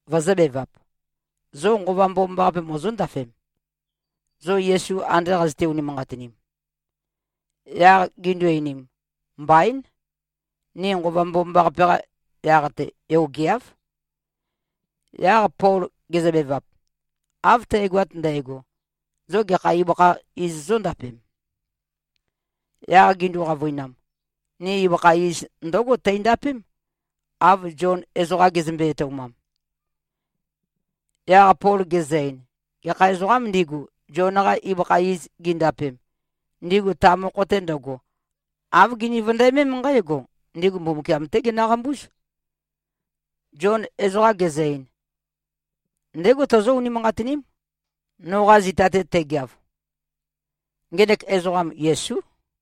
vøzø̄bevap, “Zo Nqova Mbomambaqape mozóndafem, zo Yesu ande qazøte-unimanqatinim?” Yaq gindu-einim, “Mbaín. Ni Nqova Mbomambaqape-qa yaq-te yogeáv.” Yaq Pol gezøbevap, “Av tægoat ndægo, zo gekha ibøkha iz zóndapem?” Yaq gindu-qavøinam, “Ni ibøkha iz ndǿgo teindapém, av Zion ezoqa gezømbe-etoumam.” Yaq Pol gezø-ein, “Gekha ezoqām ndigu, Zion-qa ibøkha iz gindapem, ndigu ta mokho-te ndøgo, āv gini-vøndæmém nqǽgo, ndigu Mbumbukiam-té ginøqambúz. Zion ezoqa gezø-ein, ‘Ndégo tozó-unimanqatiním, noqa zita-te tegeav.’ Ngenek ezoqam, Yesú.”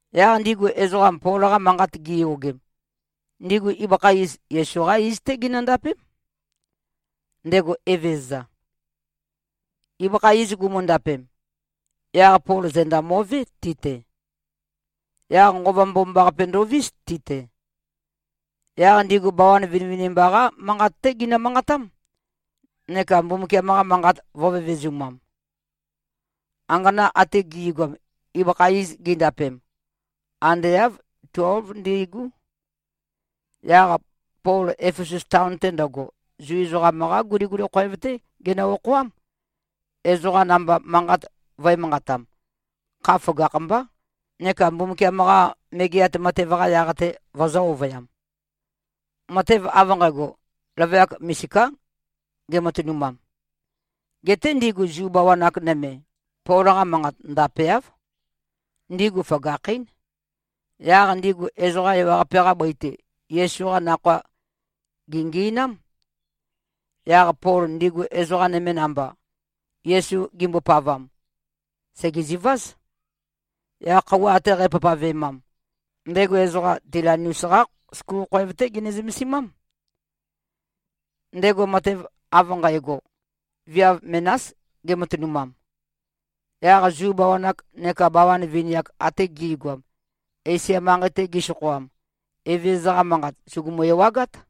Yaq ndigu ezoqam, Pol-qa manqat giyogem, ndigu ibøkha iz, Yesu-qá iz-té ginøndapém, ndego Evezøza. Ibøkha iz gumundapem, yaq Pol zenda mo꞉vé, ti-te. Yaq Nqova Mbomambaqape ndovís, ti-te. Yaq ndigu bawan vinivinimba-qá manqat-té ginø-manqatám, neka Mbumbukiam-qa manqat vø̄vevezumam. Angana ate gi꞉goam, ibøkha iz gindapem, ande āv tuélv ndi꞉gú. Yaq Pol Efesus taon-te ndøgo, Zu ezoqam-qá guliguli khoev-té genø-okhoám, ezoqa namba manqat vø̄e-manqatam, kha føgakh-mbá, neka Mbumbukiam-qa Megeat Matev-qa yaq-te vøzø̄-ovøyam. Matev av nqægo, løvøyak misiká gematønumam. Geté ndigu Zu bawan-ak nøme, Pol-qa manqat ndapeáv. Ndigu føgakhín. Yaq ndigu ezoqa ewaqape-qa bøi-te, Yesu-qa Nakhoa gèngi꞉nám. Yaq Pol ndigu ezoqa nøme namba, Yesu gimbopavam, sègeziváz. Yaq khøuwa ate qæpavpavemam, ndego ezoqa Tilanus-qá skul khoev-té gene-zømesimám. Ndego matev av nqægo, viav menás gematønumam. Yaq Zu bawan-ak nekā bawan vini-ak ate gi꞉goam, Esia manqei-te gisokhoam, Evezøza-qa Manqat sùgumu-ewagát.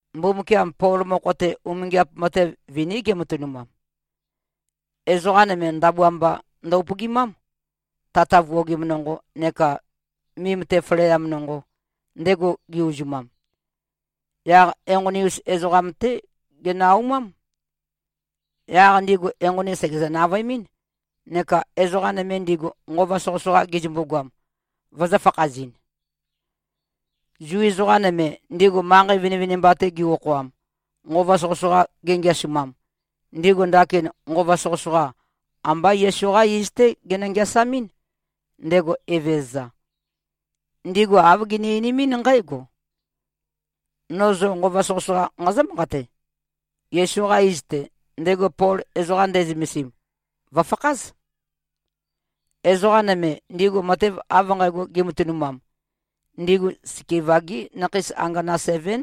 Mbumbukiam Pol mokho-te, umingiap matev viní gematønumam. Ezoqa nøme ndabua mba ndø-upøgimám, tata vuogim nonqo neka mim-te faleam nonqo, ndego ge-uzumam, yaq enqoni-us ezoqam-té ginø-aumám. Yaq ndigu enqoni sègezø-navøemɨ́n, neka ezoqa nøme ndigu, nqova soqøsoqa gizømbu-goam, vøzø̄-fakhazɨn. Zu ezoqa nøme, ndigu manqei vinivinimba-te gi-okhoam, nqova soqøsoqa gingeasumam, ndigu ndakin nqova soqøsoqa, amba Yesu-qá iz-té ginø-ngeasamɨ́n, ndego Evezøza. Ndigu āv gini-einimín nqǽgo, “No zo nqova soqøsoqa nqazǿ-manqate: Yesu-qa iz-te, ndego Pol ezoqa nde꞉zømesim, vø̀fakház.” Ezoqa nøme, ndigu matev av nqægo gimatønumam, ndigu Skeva-gí nakhei angana sevén.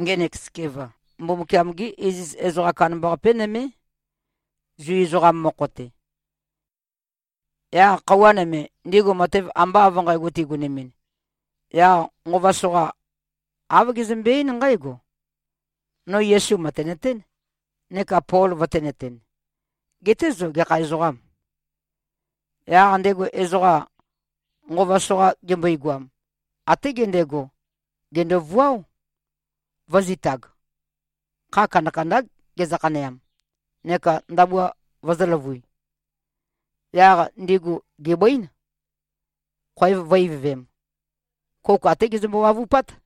Ngenek Skeva, Mbumbukiam-gé iziz ezoqa kandambaqapé nømé, Zu ezoqam mokho-te. Yaq khøuwa nøme, ndigu matev amba av nqægo tigonemɨn, yaq nqova soqa, āv gezømbe-eín nqǽgo, “No Yesu mø̀tenøtén, neka Pol vøtēnøten. Geté zo, gekha ezoqâm?” Yaq ndego ezoqam, nqova soqa gembøegoam, até gendego, gèndovuáo, vø̄zitag. Kha kandakandá gezø-khaneam, neka ndabua vøzø̄løvøi. Yaq ndigu gèbǿin, khoev vø̄-ivøvem. Kouk até gezømbo-wavupát.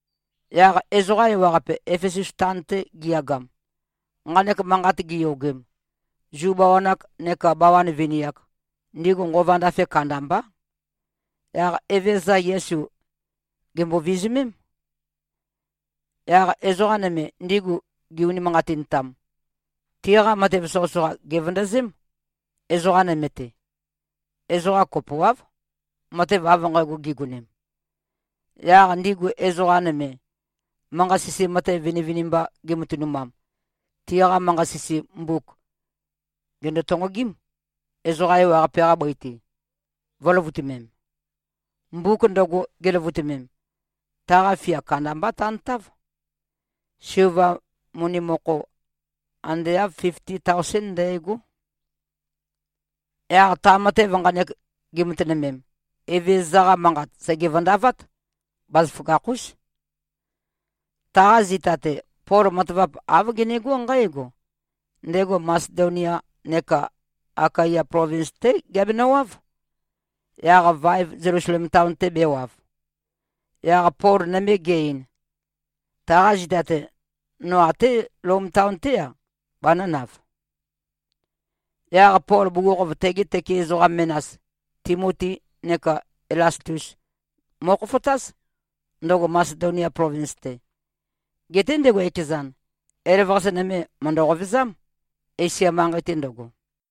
Yaq ezoqa ewaqape, Efesus taon-te giyagam, nqanek manqat giyogem, Zu bawan-ak nekā bawan vini-ak, ndigu nqova ndafe kandambá. Yaq Evezøza Yesu, gèmbo-vizumém. Yaq ezoqa nøme, ndigu gi-unimanqatintam, tiqa matev soqøsoqa gèvøndøzém, ezoqa nøme-te. Ezoqa kopoáv, matev av nqægo gigonem. Yaq ndigu ezoqa nøme, manqa-sisi matev vinivinimba gimatønumam, tiqa manqa-sisi mbuk, gèndo-tonqogím, ezoqa ewaqape-qa bøi-te, vø̄løvutømem. Mbuk ndøgo, giløvutømem, taqa fia kandambá tantáv. Silva moni mokho, ande āv fifti taosén ndægó. Yaq ta matev nqanek gi꞉matønømem, Evezøza-qa Manqat sège-vøndavát. Bazaføgakh-ús. Taqa zita-te, Pol matavap āv genegó nqǽgo: Ndego Masedonia neka Akaya plovins-té geabenøwáv, yaq vaev Zelusalem taon-te bēwav. Yaq Pol nøme ge-ein, “Taqa zita-te, no até Lom taon-té-a, banø̄nav.” Yaq Pol bugukhokhof tegi tøke ezoqa menas, Timoti neka Elastus mo꞉khofotáz, ndøgo Masedonia plovins-te. Geté ndego ekezan, elavøqase nøme mø̀ndø-qovezám, Esia manqei-te ndøgo.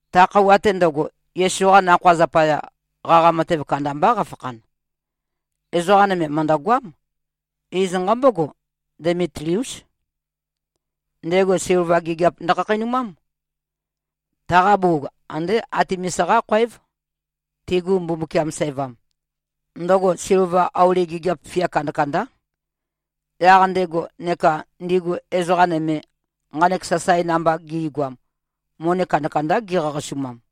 Ta khøuwa-te ndøgo, Yesu-qa Nakhoa zapaya, qaqa matev kandambá qafakhan. Ezoqa nøme mø̀ndøgoám. Iz nqambógo, Demitliús. Ndego silva gigiap ndøkhakheinumám. Taqa bugug, ande Atemis-qá khoév, tigu mbumbukiam sævam. Ndøgo silva, auli gigiap fia kandakandá. Yaq ndego neka ndigu ezoqa nøme, nqanek sasae namba gi꞉goam, moni kandakandá gi꞉qaqasumam.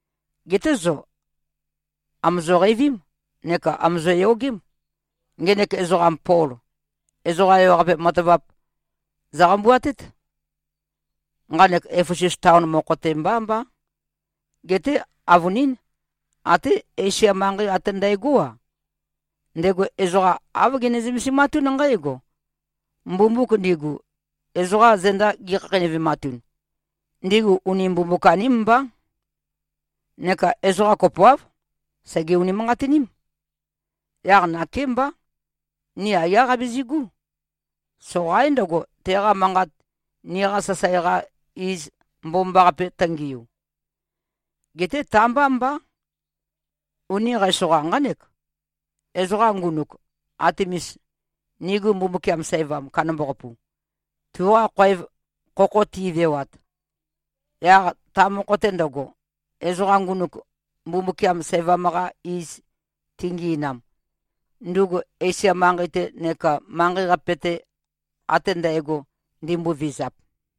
Geté zo àmozo-qeivím neka àmozo-yogém. Ngenek ezoqam Pol, ezoqa ewaqape matavap zøqambuatét. Nqanek Efesus taon mokho-te mbá mbá, geté avønín, até Esia manqei ate ndægó-a. Ndego ezoqa āv gene-zømesimatún nqǽgo: Mbumbuk ndigu, ezoqa zenda gi꞉khakheinøvematun, ndigu uni mbumbuk-aním mbá. Neka ezoqa kopoáv, sège-unimanqatiním. Yaq nakémbá, ni aiyá qabizigú. Soqaín ndøgo, teqa manqat niqa sasae-qa iz mbomambaqape tøngiu. Geté ta-mbá mbá. Uni qæsoqa nqánek, ezoqa ngunuk Atemis, nigu mbumbukiam sævam kandambaqapu, tuqa khoev khokho ti꞉vewat, yaq ta mokho-te ndøgo, ezoqa ngunuk mbumbukiam sævam-qa iz tingi꞉nam, ndugu Esia manqei-te neka manqei-qape-te ate ndægo ndimbovizap.”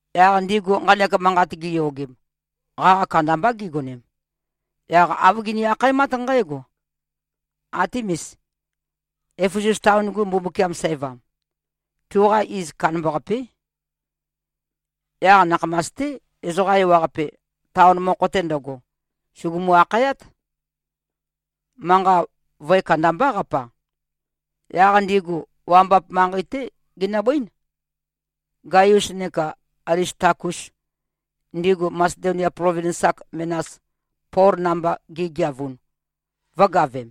Yaq ndigu nqanek manqat giyogem, qaqa kandambá gigonem. Yaq āv gini-akhaemát nqǽgo, “Atemis, Efesus taon-gu mbumbukiam sævam, tuqa iz kandambaqapé!” Yaq nakhamas-té, ezoqa ewaqape, taon mokho-te ndøgo, sùgumu-akhayát. Manqa vøe kandambá qapa. Yaq ndigu wambap manqei-té ginøbǿin, Gaius neka Alistakus, ndigu Masedonia plovins-ak menas, Pol namba gigeavun, vø̄gavem.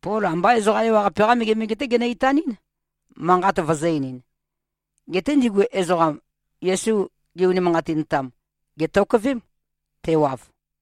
Pol ambá ezoqa ewaqape-qá megemege-té genø-itanɨ́n, manqat vøzø̄-einin. Geté ndigu ezoqam, Yesu gi-unimanqatintam, gètokøvém, tewav.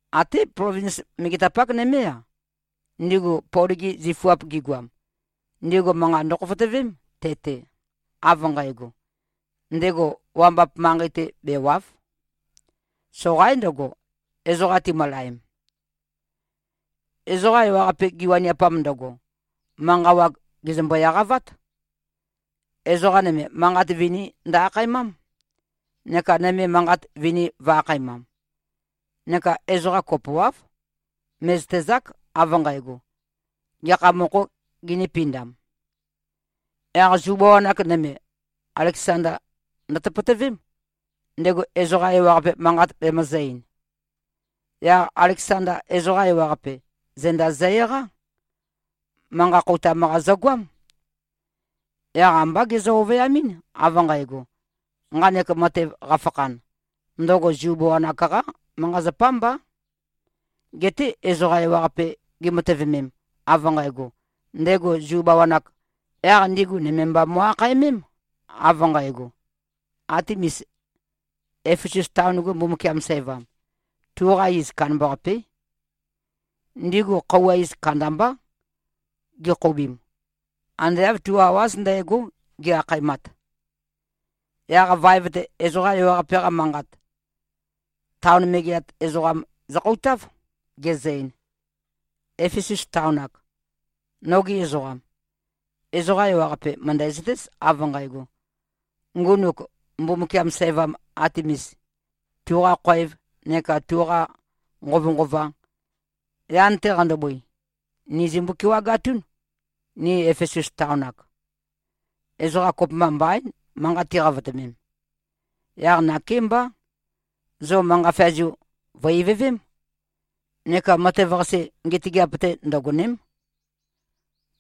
Até plovins megetapak nømé-a, ndigu Pol-gi zifuap gigoam, ndigu manqa ndøkhofotøvém te-te, av nqægo, ndego wambap manqei-te bèwa᷄v. ⌞Soqaín ndøgo, ezoqa timølaem.⌟ Ezoqa ewaqape, giwaniapam ndøgo, manqa wag gèzømbo-eqavát. Ezoqa nøme, manqat vini ndø-akhaemám, neka nøme manqat vini vø̄-akhaemam. Neka ezoqa kopoáv, mè꞉zøtezák, av nqægo, gekha mokhō gindīpindam. Yaq Zu bawan-ak nøme, Aleksanda ndøtøpøtøvém, ndego ezoqa ewaqape manqat bemøzø̄-ein. Yaq Aleksanda ezoqa ewaqape, zenda zø-eqá. Manqa khoutam-qa zøgoám. Yaq ambá gezø-ovøyamɨ́n, av nqægo, nqanek matev qafakhan, ndøgo Zu bawan-ak-qá manqa-zapá mbá. Geté ezoqa ewaqape gimatøvemem, av nqægo, ndego Zu bawan-āk, yaq ndigu nøme mba mo꞉-akhaemém, av nqægo, “Atemis, Efesus taon-gu mbumbukiam sævam, tuqa iz kandambaqapé!” Ndigu khøuwa iz kandambá gi꞉khoubim. Ande āv tu awáz ndægó, gi-akhaemat. Yaq vaev-te, ezoqa ewaqape-qa manqat, taon megeat ezoqam zøkhoutāv, gezø-ein, “Éfesus taon-ak. Nogi ezoqam. Ezoqa ewaqape mø̀ndæzøtéz, av nqægo: Ngunuk mbumbukiam sævam Atemis, tuqa khoev neka tuqa nqovønqova, yan-te qandobøi, ni zimbo-kewagatún, ni Efesus taon-ak. Ezoqa kopømba mbaín, manqa tiqavotømem. Yaq nakémbá, zo manqa feazu vø̀-ivøvém. Neka matev-qase, ngetøgeap-te ndøgòne᷄m.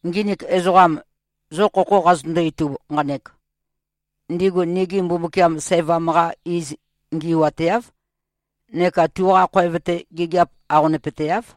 Nginik ezoqam, zo khokho qazøtøndo-itub nqanek, ndigu nigu mbumbukiam sævam-qa iz ngi꞉wateáv, neka tuqa khoev-te, gigiap aqonøpøteáv.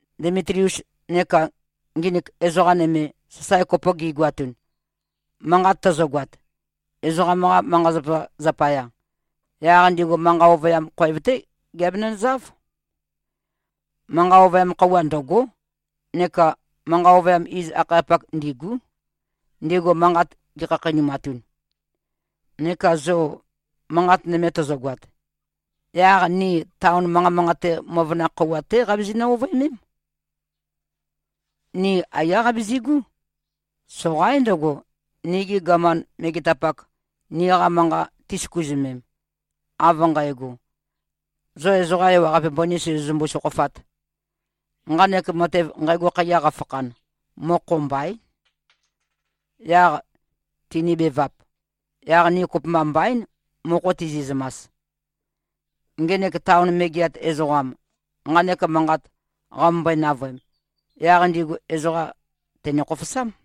Demitlius neka nginik ezoqa nøme, sasae kopo gi꞉goatun, manqat tøzøgoat, ezoqam-qa manqa-zapa zapaya, yaq ndigu manqa ovøyam khoev-té giabenøzáv. Manqa ovøyam khøuwa ndø̂gó neka manqa ovøyam iz-akhayapak ndîgú, ndigu manqat gikhakheinumatun. Neka zo manqat nøme tøzøgoat, yaq ni taon manqa manqate møvøna khøuwa-té qabizinø-ovøemém. Ni aiyá qabizigú. Soqaín ndøgo, nigi gaman megetapak, niqa manqa tisøkuzømem, av nqægo, ‘Zo ezoqa ewaqape mbøni sozozømbu-sokhofāt.’ Nqanek matev, nqægo khaiya qafakhan, mokho mbaín. Yaq tinibevap, yaq ni kopømba mbaín, mokho tizi꞉zømas.” Ngenek taon megeat ezoqam, nqanek manqat qamømbøe-navøem, yaq ndigu ezoqa tène-khofosám.